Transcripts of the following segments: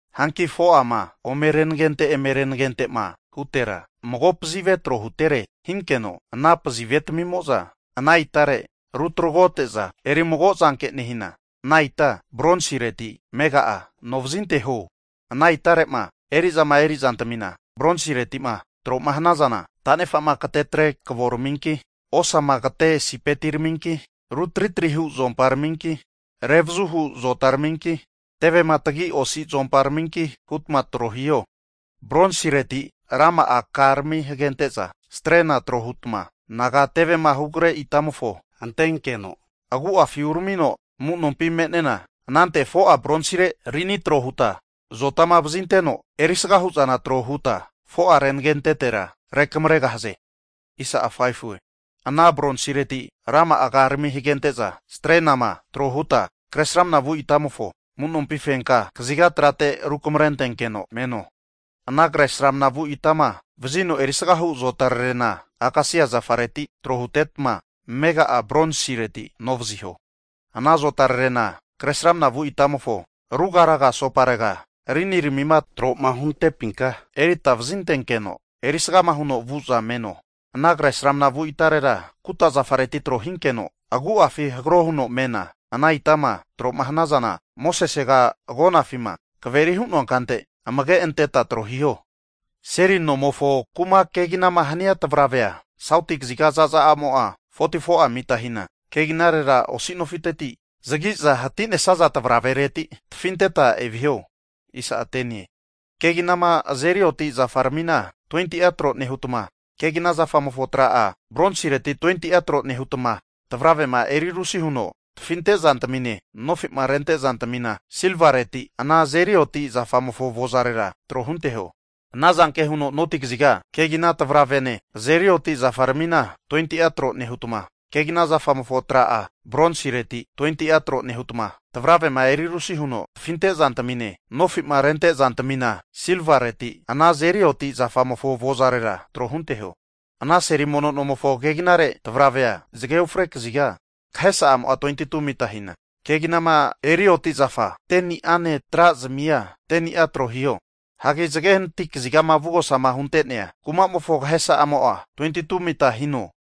Hanki 4'ama omerenagente emerenagentema hutera mago pazive tro huntetere hinkeno, ana pazivetamimo'za ana itare rutragote'za erimago zanke nehina, ana ita bronsireti amega'a anovazinteho. Ana itare'ma eri'zama eri'zantamina bronsireti'ma tro'ma hanazana, tanefa'ma katetre kavoraminki, osama kate sipetiraminki, ru tritri hu zuomparaminki, revazuhu zotaraminki, tevema tagi osi zuomparaminki hutma tro hiho. Bronsireti rama'a karami hagente'za strena tro hutma anaga tevema hugre itamofo antenkeno agu'afi uramino amu'nompi me'nena, anante 4'a bronsire rini tro huta zotama vazinteno erisga hu'zana tro huta 4'a renagentetera rukamregahaze. Anama Bronsireti rama'a karami hagente'za strenama tro huta kresramna vu itamofo amu'nompi fenka kaziga trate rukamrentenkeno meno. Ana kresramna vu itama vazino erisagahu azotarerena akasia zafareti tro hutetma amega'a bronsireti anovaziho. Ana azotarerena kresramna vu itamofo rugaraga asoparega riniramima tro'ma huntepinka erita vazintenkeno, erisgama huno vu'za meno. Ana kresramna vu itarera kuta zafareti tro hinkeno, agu'afina hagro huno mena, ana itama tro'ma hanazana, Mosesega agonafima kaveri'ma hu'noa kante amage anteta tro hiho. Seli mono nomofo kuma keginama hanaza tavravea, sauti kaziga zaza'amo'a 44'a mita hina, keginarera osi nofiteti zagi'za hati'nesaza tavaravereti tafinteta eviho. Keginama azeri oti zafaramina 20'a tro nehutma, kegina zafamofo tra'a bronsireti 20'a tro nehutma, tavravema erirusi huno tafinte'zantamine nofi'ma rente'zantamina silvareti ana azeri oti zafamofo avozarera tro hunteho. Ana zanke huno noti kaziga keginahu tavravene azeri oti zafaramina 20'a tro nehutma, kegina zafamofo tra'a bronsireti 20'a tro nehutma, tavravema erirusi huno tafinte'zantamine nofi'ma rente'zantamina silvareti ana azeri oti zafamofo avozarera tro hunteho. Ana seli mono nomofo keginare tavravea zage ufre kaziga kahesa'amo'a 22'a mita hina, keginama eri oti'zafa 10ni'ane tra zamianena, 10ni'a tro hiho. Hanki zage hanati kaziga avugosama hunte'nea kumamofo kahesa'amo'a 22'a mita hino.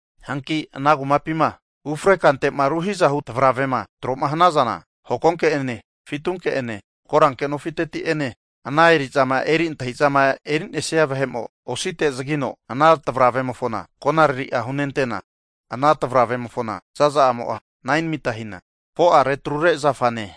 Hanki ana kumapima ufre kante'ma ruhi'zamahu tavaravema tro'ma hanazana, hokonke'ene, fitunke'ene, koranke nofiteti'ene, ana eri'zama eri antahi'zama eri'nesia vahe'mo osite zagino ana tavravemofona konariri'a hunentena, ana tavravemofona zaza'amo'a 9'a mita hina, 4'a retrure zafane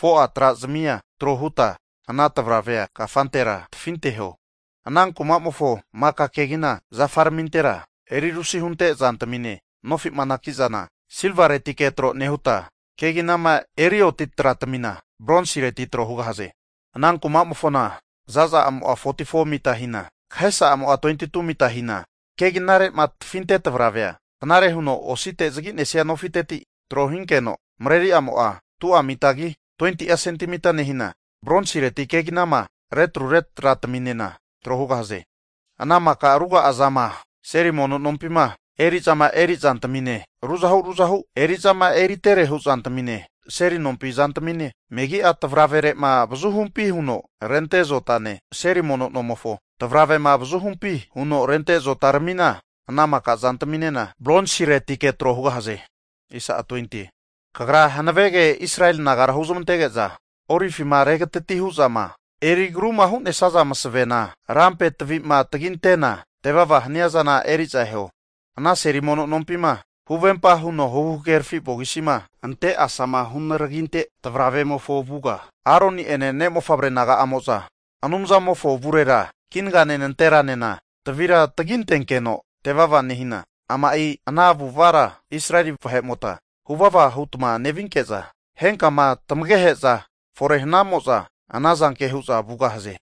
4'a trazamia tro huta ana tavravea kafantera tafinteho. Ana kuma'mofo maka kegina zafaramintera, erirusi hunte zantamine nofi'ma anaki'zana silvaretike tro nehuta, keginama eri oti tratamina bronsireti tro hugahaze. Ana kumamofona zaza'amo'a 44'a mita hina, kahesa'amo'a 22'a mita hina, keginare'ma tafinte tavravea, knare huno osite zagi'nesia nofiteti trohinkeno mareri'amo'a 2'a mitagi 20'a sentemita nehina, bronsireti keginama retrure trataminena tro hugahaze. Ana maka ruga'azama seli mono nompima eri'zama eri'zantamine, ruzahu ruzahu eri'zama eriterehu zantamine, seli nompi zantamine, megi'a tavravere'ma avazuhumpi huno rente zotane, seli mono nomofo tavravema avazuhumpi huno rente azotaramina, ana maka zantaminena bronsiretike tro hugahaze. Kagra hanavege Israeli nagara huzamantege'za olivima regatati hu'zama eri agruma hu'nesaza masavena lampe tavima tagintena tevava hania zana eri'za eho. Ana seli mono nompima, huvempa huno huhagerafi vogisima ante asama hunaraginte tavravemofo avuga, Aroni'ene ne' mofavre naga'amo'za Anumzamofo avurera kinagane nanteranena tavira tagintenkeno tevava nehina, ama'i ana avu'avara Israeli vahe'mota huvava hutma nevinke'za henkama tamagehe'za fore hanamo'za ana zanke hu'za vugahaze.